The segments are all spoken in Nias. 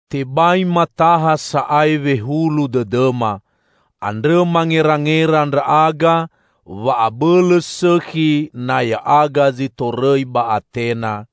Tebai mataha sa'ae wehulu dõdõma. Andrõ mangerangera ndra'aga wa abõlõ sõkhi na ya'aga zi torõi ba Atena,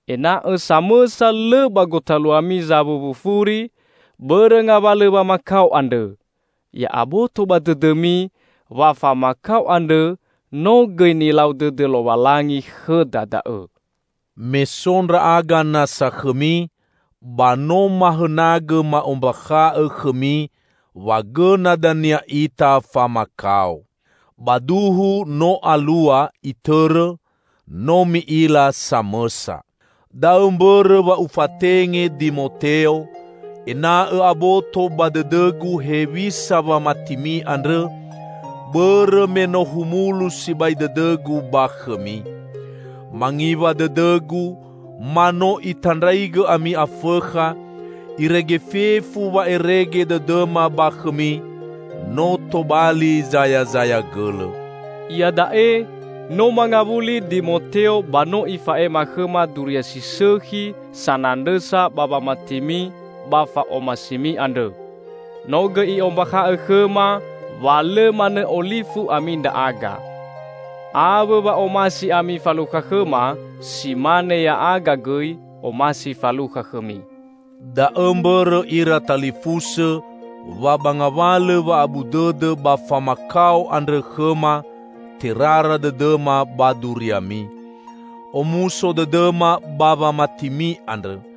ena'õ samõsa lõ ba gotaluami zawuwu furi, bõrõ ngawalõ wamakao andrõ. Ya'aboto ba dõdõmi wa famakao andrõ no gõi nilau dõdõ Lowalangi khõda da'õ. Me so ndra'aga nasa khõmi, ba no mahõnagõ ma'ombakha'õ khõmi wa gõna dania ita famakao. Ba duhu no alua itõrõ; no mi'ila samõsa. Da'õ mbõrõ wa ufatenge Dimoteo, ena'õ aboto ba dõdõgu hewisa wamatimi andrõ, bõrõ me no humulu sibai dõdõgu ba khõmi. Mangiwa dõdõgu ma no itandraigõ ami Afõkha, irege fefu wa'erege dõdõma ba khõmi no tobali zayazaya gõlõ. Iada'e no mangawuli Dimoteo ba no ifa'ema khõma duria si sõkhi sanandrõsa ba wamatimi ba fa'omasimi andrõ. No gõi i'ombakha'õ khõma wa lõ manõ olifu ami ndra'aga. Awõ wa omasi ami falukha khõma, si mane ya'aga gõi omasi falukha khõmi. Da'õ mbõrõ, ira talifusõ, wa ba ngawalõ wa'abu dõdõ ba famakao andrõ khõma, terara dõdõma ba duriami. Omuso dõdõma ba wamatimi andrõ,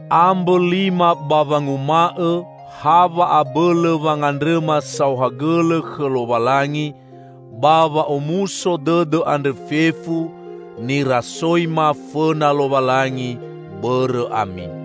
Ambõ lima ba wanguma'õ ha wa'abõlõ wangandrõma saohagõlõ khõ Lowalangi ba wa'omuso dõdõ andrõ fefu, nirasoima fõna Lowalangi, bõrõ ami.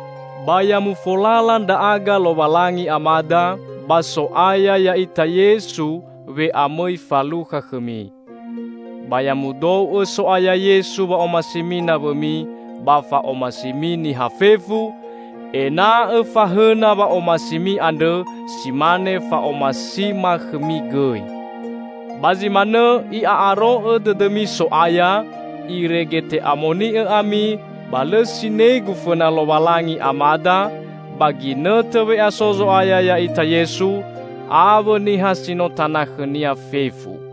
Ba ya mufolala ndra'aga Lowalangi Amada, ba So'aya ya'ita Yesu we'amõi falukha khõmi! Ba ya mudou'õ So'aya Yesu wa'omasimi nawõmi ba fa'omasimi niha fefu, ena'õ fahõna wa'omasimi andrõ, si mane fa'omasima khõmi gõi. Ba zi manõ i'a'aro'õ dõdõmi So'aya, irege te'amoni'õ ami ba lõ sinegu fõna Lowalangi Amada, ba ginõtõ we'aso Zo'aya ya'ita Yesu, awõ niha si no tana khõ-Nia fefu.